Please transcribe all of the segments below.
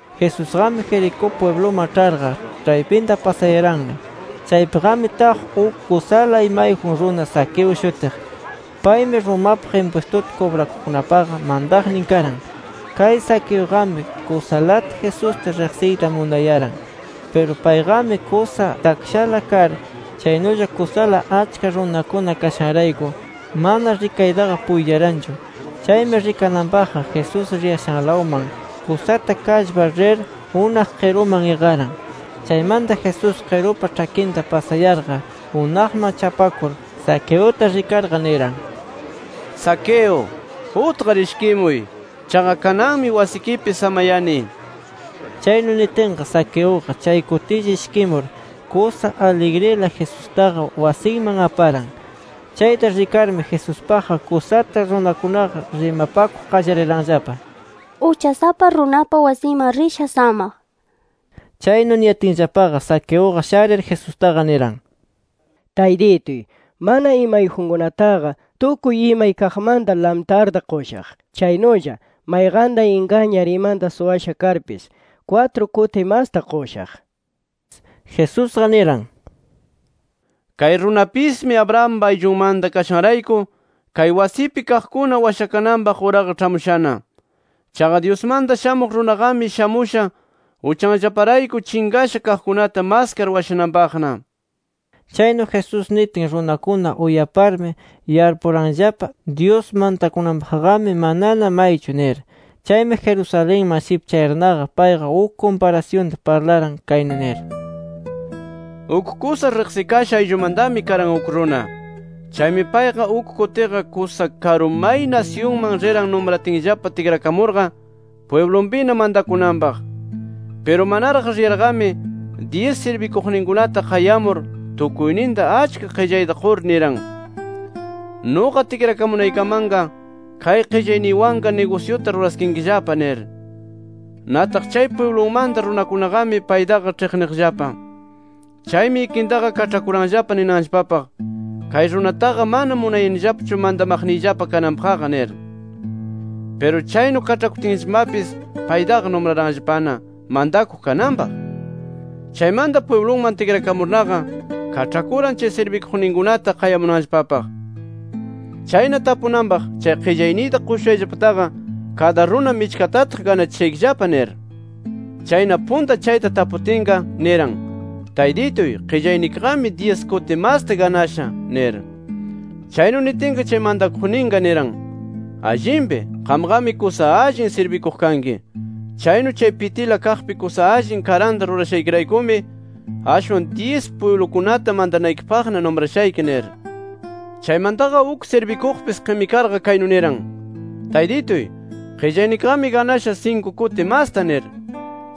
Jesusqami Jericó pwibluman ĉharqa, ĉhaypinta pasayaranna. Chaypiqami taq uk kusala imayjun runa Zaqueo shutiq. Paymi Romapaq impwistuta kubrakuqkunapaqa mantaqnin karan. Kay Zaqueuqami kusalata Jesusta riqsiyta munayaran. Piru payqami kusa takshala kar, chaynulla kusala achka runakuna kashanrayku mana rikaytaqa puytiyaranchu. Chaymi, rikananpaqqa Jesús riyashanlawman kusata kallpar rir, unaq qiruman iqaran. Chaymanta Jesús qirupa ĉhakinta pasayarqa, unaqman chapakur Zaqueuta rikarqa, niran: —Zaqueo, utqar ishkimuy. Chaqa kananmi wasikipi samayani nir. Chaynu nitinqa, Zaqueuqa chay kutilla ishkimur, kusa aligrila Jesustaqa wasinman aparan. Chayta rikarmi, Jesuspaqqa kusata runakunaqa rimapakuq qallariranllapa: “Uchasapa runapa wasinman risha samaq” nir. Chaynu niyatinllapaqa, Zaqueuqa sharir Jesustaqa niran: —¡Taytituy!, mana imayjunkunataqa tukuy imay kaqmanta lamtarta qushaq. Chaynulla mayqanta ingañar imanta suwasha karpis, kwatru kuti masta qushaq nir. Jesusqa niran: —Kay runapismi Abrahampa ayllunmanta kashanrayku, kay wasipi kaqkuna washakananpaq uraqa ĉhamushana. Chaqa Dyusmanta Shamuq Runaqami shamusha uchanllaparayku chinqasha kaqkunata maskar washananpaqna. Chaynu Jesús nitin runakuna uyaparmi yarpuranllapa, Dyus mantakunanpaqqami manana maychu nir. Chaymi Jerusalenman shipchayarnaqa payqa uk kumparasyunta parlaran, kaynu nir: “Uk kusa riqsikasha ayllumantami karan uk runa. Chaymi payqa uk kutiqa kusa karu may nasyunman riran numratinllapa tikrakamurqa pwiblunpina mantakunanpaq. Piru manaraq riyarqami, dyis sirbikuqninkunata qayamur, tukuyninta achka qillayta qur, niran: ‘Nuqa tikrakamunaykamanqa kay qillayniykunawanqa nigusyuta ruraskinkillapa’ nir. “Nataq chay pwiblunmanta runakunaqami paytaqa ĉhiqniqllapa. Chaymi ikintaqa kaĉhakuranllapa ninanllapapaq: ‘Kay runataqa mana munayanillapachu mantaqniyllapa kananpaqqa’ nir. “Piru chaynu kaĉhakutinllapamapis, paytaqa numraranllapana mantakuq kananpaq. Chaymanta pwibluman tikrakamurnaqa, kaĉhakuran chay sirbikuqninkunata qayamunanllapapaq. Chayna tapunanpaq, chay qillayninta qushushayllapataqa, kada runa michkatataq ganachishaykillapa nir. “Chayna punta chayta taputinqa, niran: ‘Taytituy, qillaynikiqami dyis kuti masta ganasha’ nir. Chaynu nitinqa, chay mantakuqninqa niran: ‘Allinpi. Qamqami kusa allin sirbikuq kanki. Chaynu chay pitila kaqpi kusa allin karanta rurashaykiraykumi ashwan dyis pwiblukunata mantanaykipaqna numrashayki’ nir. “Chaymantaqa uk sirbikuqpis qimikarqa kaynu niran: ‘Taytituy, qillaynikiqami ganasha sinku kuti masta’ nir.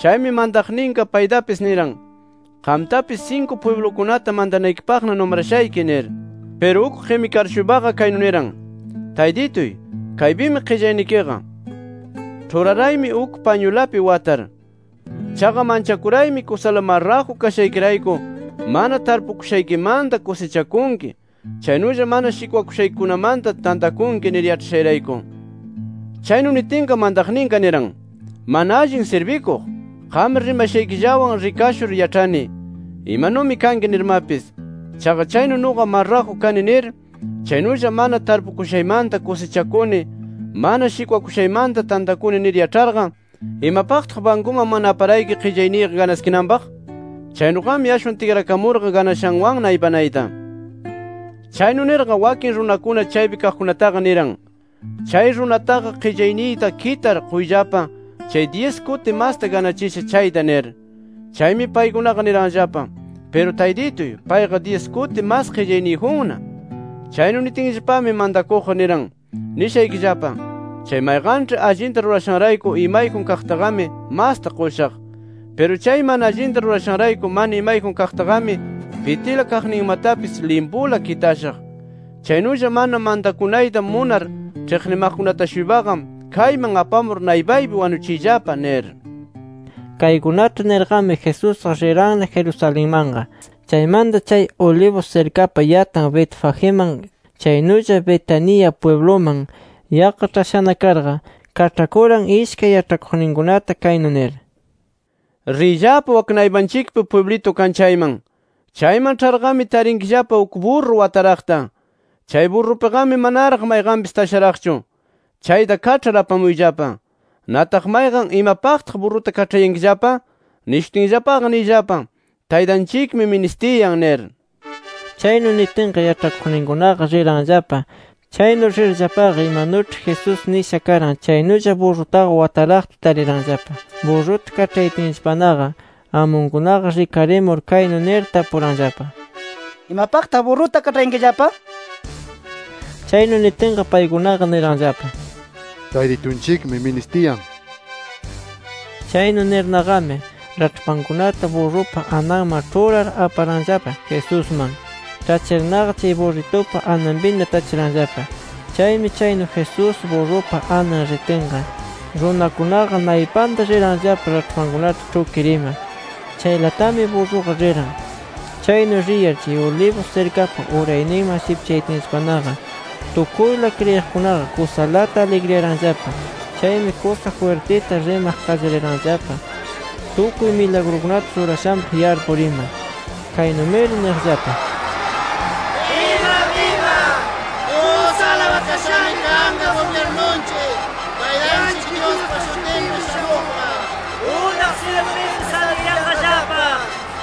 Chaymi mantaqninqa paytapis niran: ‘Qamtapis sinku pwiblukunata mantanaykipaqna numrashayki’ nir. “Piru uk qimikar-shuypaqa kaynu niran: ‘Taytituy, kaypimi qillaynikiqa. Ĉhuraraymi uk pañulapi watar. Chaqa manchakuraymi, kusala marraju kashaykirayku mana tarpukushaykimanta kusichakunki, chaynulla mana shikwakushaykikunamanta tantakunki nir, yaĉhashayrayku’. Chaynu nitinqa, mantaqninqa niran: ‘Mana allin sirbikuq, qam rimashaykillawan rikashur yaĉhani, imanumi kanki nirmapis. Chaqa chaynu nuqa marraju kani nir, chaynulla mana tarpukushaymanta kusichakuni, mana shikwakushaymanta tantakuni nir yaĉharqa, ¿Imapaqtaq bankuman mana aparayki qillayniyqa ganaskinanpaq? Chaynuqami ashwan tikrakamurqa ganashanwanna aypanayta’. “Chaynu nirqa, wakin runakuna chaypi kaqkunataqa niran: ‘Chay runataqa qillayniyta kitar quyllapa, chay dyis kuti masta ganachisha chayta’ nir. Chaymi paykunaqa niranllapa: ‘¡Piru Taytituy, payqa dyis kuti mas qillayniyjunna!’ “Chaynu nitinllapami mantakuqqa niran: ‘Nishaykillapa: Chay mayqanĉhi allinta rurashanrayku, imayjun kaqtaqami masta qushaq. Piru chay mana allinta rurashanrayku mana imayjun kaqtaqami, pitila kaqninmatapis limpula kitashaq. Chaynulla mana mantakunayta munar ĉhiqnimaqkunata-shuypaqa, kayman apamur naypaypi wanuchiyllapa’ nir”. Kaykunata nirqami, Jesusqa riranna Jerusalenmanqa. Chaymanta, chay Olivos sirkapa yatan Betfagiman, chaynulla Betania pwibluman yaqqa ĉhashana karqa, kaĉhakuran ishkay yaĉhakuqninkunata, kaynu nir: —Riyllapa, wak naypanchikpi pwiblitu kan chayman. Chayman ĉharqami, tarinkillapa uk burru wataraqta. Chay burrupiqami manaraq mayqanpis tasharaqchu. Chayta kaĉhar apamuyllapa. Nataq, mayqan ‘¿Imapaqtaq burruta kaĉhayankillapa?’ nishutinllapaqa, niyllapa ‘Taytanchikmi ministiyan’ nir. Chaynu nitinqa, yaĉhakuqninkunaqa riranllapa. Chaynu rirllapaqa, imanuĉhi Jesús nisha karan chaynulla burrutaqa wataraqta tariranllapa. Burruta kaĉhayatinllapanaqa amunkunaqa rikarimur kaynu nir tapuranllapa: —¿Imapaqtaq burruta kaĉhayankillapa? nir. Chaynu nitinqa paykunaqa niranllapa: —Taytitunchikmi ministiyan nir. Chaynu nirnaqami, raĉhpankunata burrupa ananman ĉhurar aparanllapa Jesusman. Ĉhachirnaqa, chay burritupa ananpina tachiranllapa. Chaymi chaynu Jesús burrupa anan ritinqa, runakunaqa naypanta riranllapa raĉhpankunata ĉhukir ima. Chaylatami burruqa riran. Chaynu riyar chay Olivos sirkapa urayninman shipchayatinllapanaqa, tukuyla kriyiqkunaqa kusalata aligriyaranllapa. Chaymi kusa jwirtita rimaq qallariranllapa tukuy milagrukunata rurashanpaq yarpur ima. Kaynumiri niyaqllapa: “¡Biba biba! ¡Kusa alabakashami kanqa gubyirnunchik, Taytanchik Dyuspa shutinpi shamuqqa! ¡Unaq syilupipis aligriyanqallapa!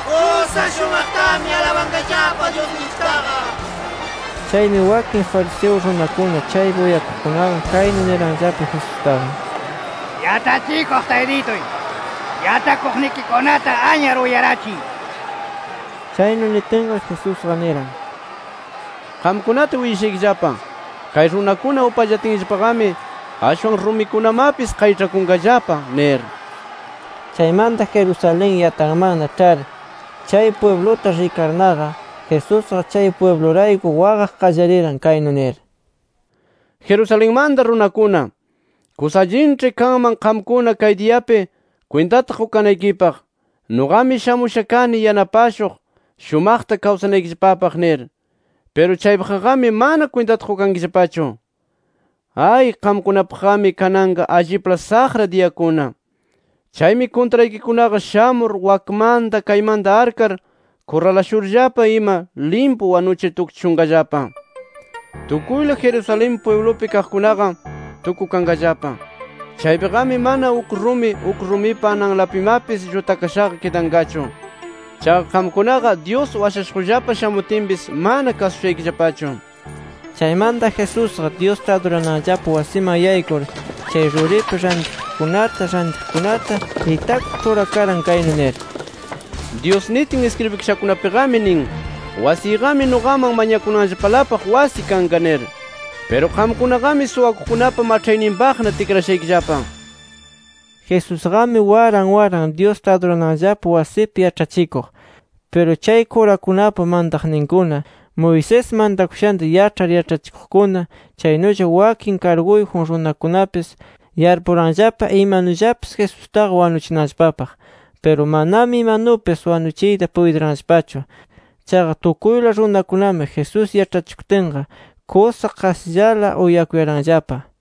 ¡Kusa shumaqtami alabanqallapa Dyusninchiktaqa!” nir. Chaymi wakin fariseo runakuna chaypi uyakuqkunaqa, kaynu niranllapa Jesustaqa: —Yaĉhachikuq Taytituy, yaĉhakuqnikikunata anyar uyarachiy nir. Chaynu nitinqa, Jesusqa niran: —Qamkunata willashaykillapa, kay runakuna upallatinllapaqami ashwan rumikunamapis qayĉhakunqallapa nir. Chaymanta Jerusalén yatanmanna ĉhar chay pwibluta rikarnaqa, Jesusqa chay pwiblurayku waqaq qallariran kaynu nir: “¡Jerusalenmanta runakuna! Kusa allinĉhi kanman qamkuna kay diyapi kwintata qukanaykipaq, nuqami shamusha kani yanapashuq, shumaqta kawsanaykillapapaq nir. Piru chaypaqqami mana kwintata qukankillapachu. Ay, qamkunapaqqami kanqa allipla saqra diyakuna. Chaymi kuntraykikunaqa shamur, wakmanta kaymanta arkar kurralashurllapa ima, limpu wanuchir tukchishunqallapa. Tukuyla Jerusalén pwiblupi kaqkunaqa, tukukanqallapa. Chaypiqami, mana uk rumi, uk rumipa ananlapimapis llutakashaqa kidanqachu. Chaqa qamkunaqa, Dyus washashuqllapa shamutinpis, mana kasushaykillapachu”. Chaymanta Jesusqa, Dyusta adurananllapa wasiman yaykur, chay ruripi rantikuqkunata, [rantiqkunata] itakuq ĉhurakaran, kaynu nir: “Dyus nitin iskribikashakunapiqami nin: ‘Wasiyqami nuqaman mañakunanllapalapaq wasi kanqa’ nir. Piru qamkunaqami suwakuqkunapa maĉhayninpaqna tikrashaykillapa” nir. Jesusqami waran waran, Dyusta adurananllapa wasipi yaĉhachikuq. Piru chay kurakunapa mantaqninkuna, Moisés mantakushanta yaĉhar yaĉhachikuqkuna, chaynulla wakin karguyjun runakunapis, yarpuranllapa imanullapis Jesustaqa wanuchinanllapapaq. Piru manami imanupis wanuchiyta puytiranllapachu. Chaqa tukuyla runakunami Jesús yaĉhachikutinqa kusa qasillala uyakuyaranllapa.